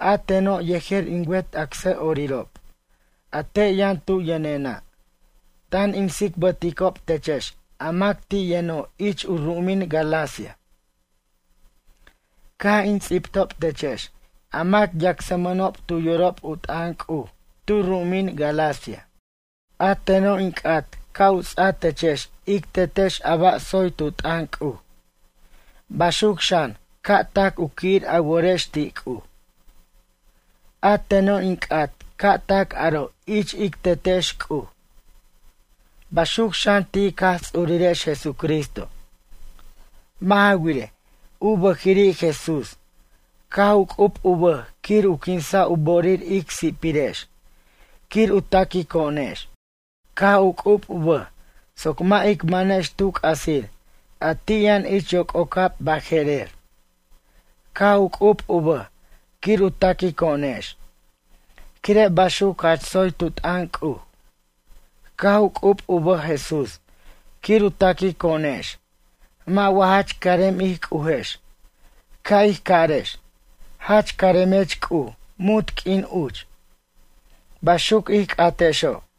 A teno' yejer in wet acsʌ'orirob a te' yʌn tu yʌnena', tan in ts'ibticob techex a mac ti' yʌno' ich u ru'umin Galacia. Caj in ts'ibtob techex a mac yacsmʌnob tu yorob u t'ʌn C'uj tu ru'umin Galacia. A teno' in c'at ca' u ts'a techex ic Tetex a ba' tsoy tu t'ʌn C'uj, baxuc xan ca' tac u qui'ir a worex ti' C'uj. A teno' in c'at ca' tac aro' ich ic Tetex C'uj. Baxuc xan ti' ic Jaj Ts'urirex Jesucristo. Mʌ' ja wirej, u bʌjiri' Jesús caj u c'ub u bʌj quir u quinsa' u bo'orir ic si'pirex quir u taquico'onex. Caj u c'ub u bʌj soc mʌ' ic mʌnex tu c'asir a ti' yʌn ich yoc'ocab baje'rer. Caj u c'ub u bʌj quir u taquico'onex quire' baxuc jach tsoy tu t'ʌn C'uj. Caj u c'ub u bʌj Jesús quir u taquico'onex mʌ' wa jach carem ij C'ujex, ca' ij carex: “Jach caremech C'uj munt q'uin uch.” Baxuc ij c'atexo'.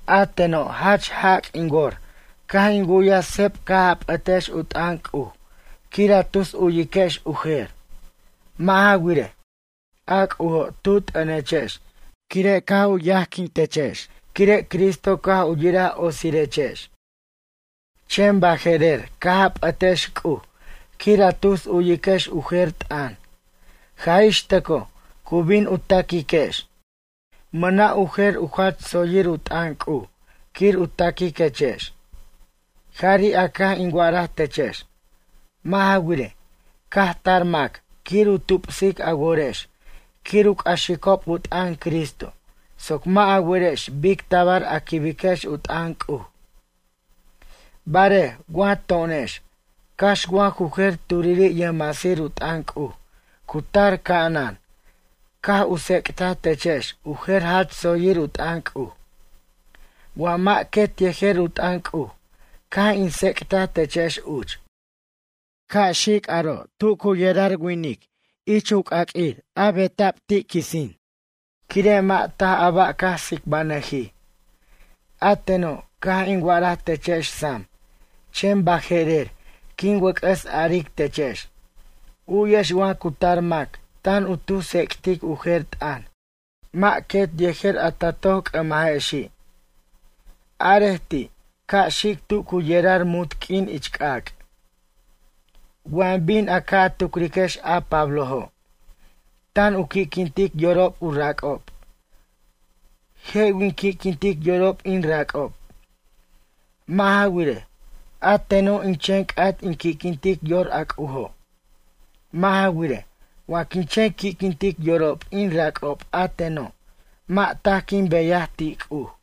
A teno' jach jac' in wor caj in wu'yaj sep caj a p'ʌtex u t'ʌn C'uj quir a tus uyiquex u jer. Mʌ' ja wirej, a C'ujo' tu t'ʌnechex quire' caj u yajechex quire' Cristo caj u yiraj otsirechex. Chen baje'rer caj a p'ʌtex C'uj quir a tus uyiquex u jer u t'ʌn, jaj ix tʌcoj cu bin u taquiquex. Mʌna' u jer u jach tsoyir u t'ʌn C'uj quir u taquiquechex. Jari' a caj in wa'araj techex. Mʌ' ja wirej, caj tar mac quir u tubsic a worex quir u c'axicob u t'ʌn Cristo soc mʌ' a werex bic tabar a quibiquex u t'ʌn C'uj. Barej wa to'onex cax wa ju jer turi' yʌjmasir u t'ʌn C'uj cu tar ca'anan caj u tsec'taj techex u jer jach tsoyir u t'ʌn C'uj. Wa mʌ' quet yejer u t'ʌn C'uj caj in tsec'taj techex uch. Ca' xic aro' tu cu yerar winic ich c'aq'uir benaj quisin. Quire' mʌ' taj a ba' caj tsicbanʌjij. A teno' caj in wa'araj techex sam chen baje'rer quin wʌc'ʌs aric techex: U'yex wa cu tar mac tan u tus tsec'tic u jer t'ʌn mʌ' quet yejer a ta toc c'ʌmajexi'. Arej ti' ca' xic tu cu yerar munt q'uin ich c'ac'. Wa bin a ca' tucriquex a Pablojo', tan u qui'quintic yorob u rac'ob, je' win qui'quintic yorob in rac'ob? Mʌ' ja wirej, a teno' in chen c'at in qui'quintic yor a C'ujo'. Mʌ' ja wirej, wa quin chen qui'quintic yorob in rac'ob a teno' mʌ' taj quin beyaj ti' C'uj.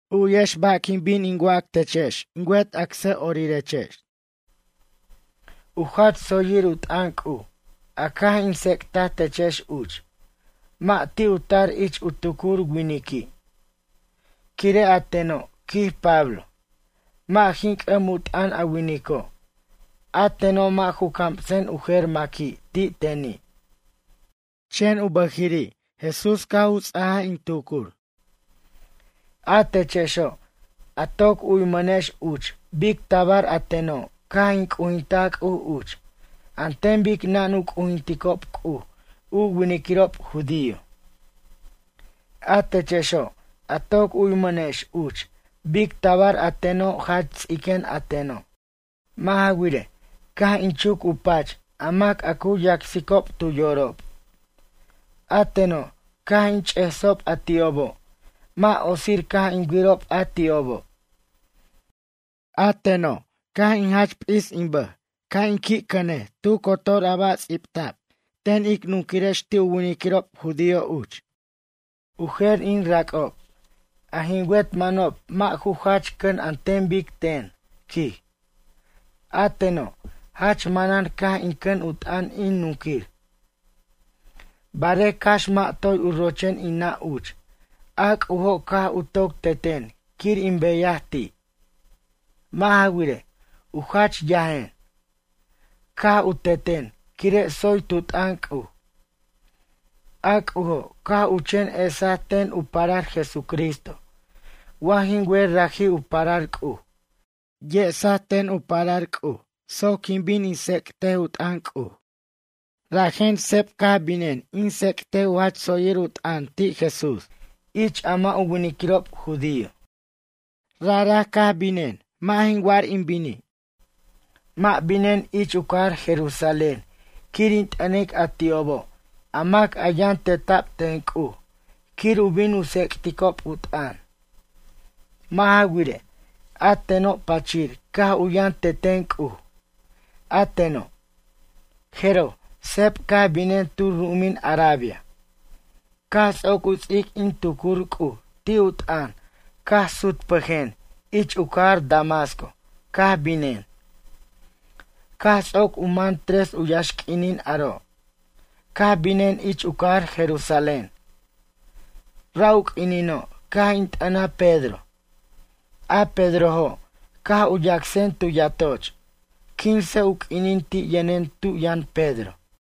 U'yex ba' quin bin in wac techex in wet acsʌ'orirex. U jach tsoyir u t'ʌn C'uj, a caj in tsec'taj techex uch, mʌ' ti' u tar ich u tucur winiqui'. Quire' a teno', quij Pablo, mʌ' jin c'ʌm u t'ʌn a winico'. A teno' mʌ' ju camsen u jer maqui' ti' teni'. Chen u bʌjiri' Jesús caj u ts'aj in tucur. A techexo', a toc u'yamʌnex uch bic tabar a teno' caj in c'ujintaj C'uj uch an ten bic nan u c'ujintajob C'uj u winiquirob judío. A techexo' a toc u'yamʌnex uch bic tabar a teno' jach ts'iquen a teno'. Mʌ' ja wirej, caj in chuc u pach a mac a cu yacsicob tu yorob. A teno' caj in ch'esob a ti'obo', mʌ' otsir caj in wirob a ti'obo'. A teno' caj in jach p'is in bʌj ca' in qui' cʌnej tu cotor a ba' ts'ibta'b ten ic nunquirex ti' u winiquirob judío uch. U jer in rac'ob a jin wet mʌnob mʌ' ju jach cʌn an ten bic ten, quij. A teno' jach manan caj in cʌn u t'ʌn in nunquir. Barej cax mʌ' toy u rochen in nʌ' uch a C'ujo' caj u toc teten quir in beyaj ti'. Mʌ' ja wirej, u jach yajen. Caj u teten quire' tsoy tu t'ʌn C'uj. A C'ujo' caj u chen esaj ten u parar Jesucristo wa jin wer raji' u parar C'uj. Yesaj ten u parar C'uj soc quin bin in tsec't u t'ʌn C'uj. Rajen seb caj binen in tsec't u jach tsoyir u t'ʌn ti' Jesús ich a mʌ' u winiquirob judío. Raja caj binen mʌ' jin war in bini'. Mʌ' binen ich u cajar Jerusalén quir in t'ʌnic a ti'obo' a mac a yʌn teta'b ten C'uj quir u bin u tsec'ticob u t'ʌn. Mʌ' ja wirej, a teno' pachir caj u yʌn teten C'uj, a teno'. Jeroj seb caj binen tu ru'umin Arabia. Caj ts'oc u ts'ic in tucur C'uj ti' u t'ʌn caj sutpʌjen, ich u cajar Damasco caj binen. Caj ts'oc u man tres u yaxq'uinin aro' caj binen ich u cajar Jerusalén. Ra' u q'uinino' caj in t'ʌna Pedro. A Pedrojo' caj u yacsen tu yatoch. Quince u q'uinin ti' yʌnen tu yʌn Pedro.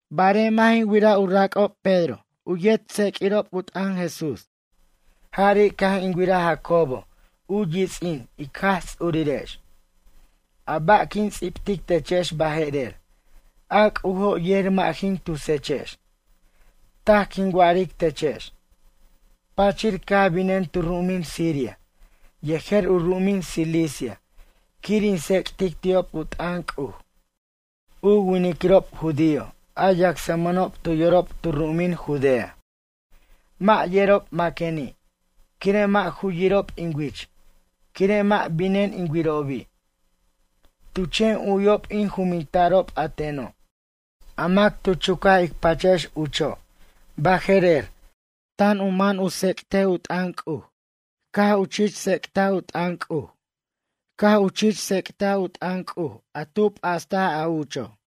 Barej mʌ' jin wir u rac'ob, Pedro u yet yʌjtseq'uirob u t'ʌn Jesús. Jari' caj in wiraj Jacobo u yits'in Ic Jaj Ts'urirex. A ba' quin ts'ibtic techex baje'rer a C'ujo' yer mʌ' jin tusechex. Taj quin wa'aric techex. Pachir caj binen tu ru'umin Siria yejer u ru'umin Cilicia quir in tsec'tic ti'ob u t'ʌn C'uj. U winiquirob judío a yacsmʌnob tu yorob tu ru'umin Judea, mʌ' yerob maqueni' quire' mʌ' ju yirob in wich quire' mʌ' binen in wirobi'. Tu chen u'yob in jumintarob a teno': “A mac tu chucaj ic pachex ucho' baje'rer, tan u mʌn u tsec't u t'ʌn C'uj. Caj u chich tsec't u t'ʌn C'uj. Caj u chich tsec't u t'ʌn C'uj a tu p'ast a ucho'.”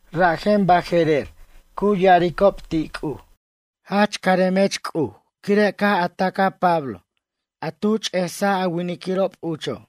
Rajen baje'rer cu ya'aricob ti' C'uj: “Jach caremech C'uj quire' caj a tacaj Pablo a tu ch'esic a winiquirob ucho'.”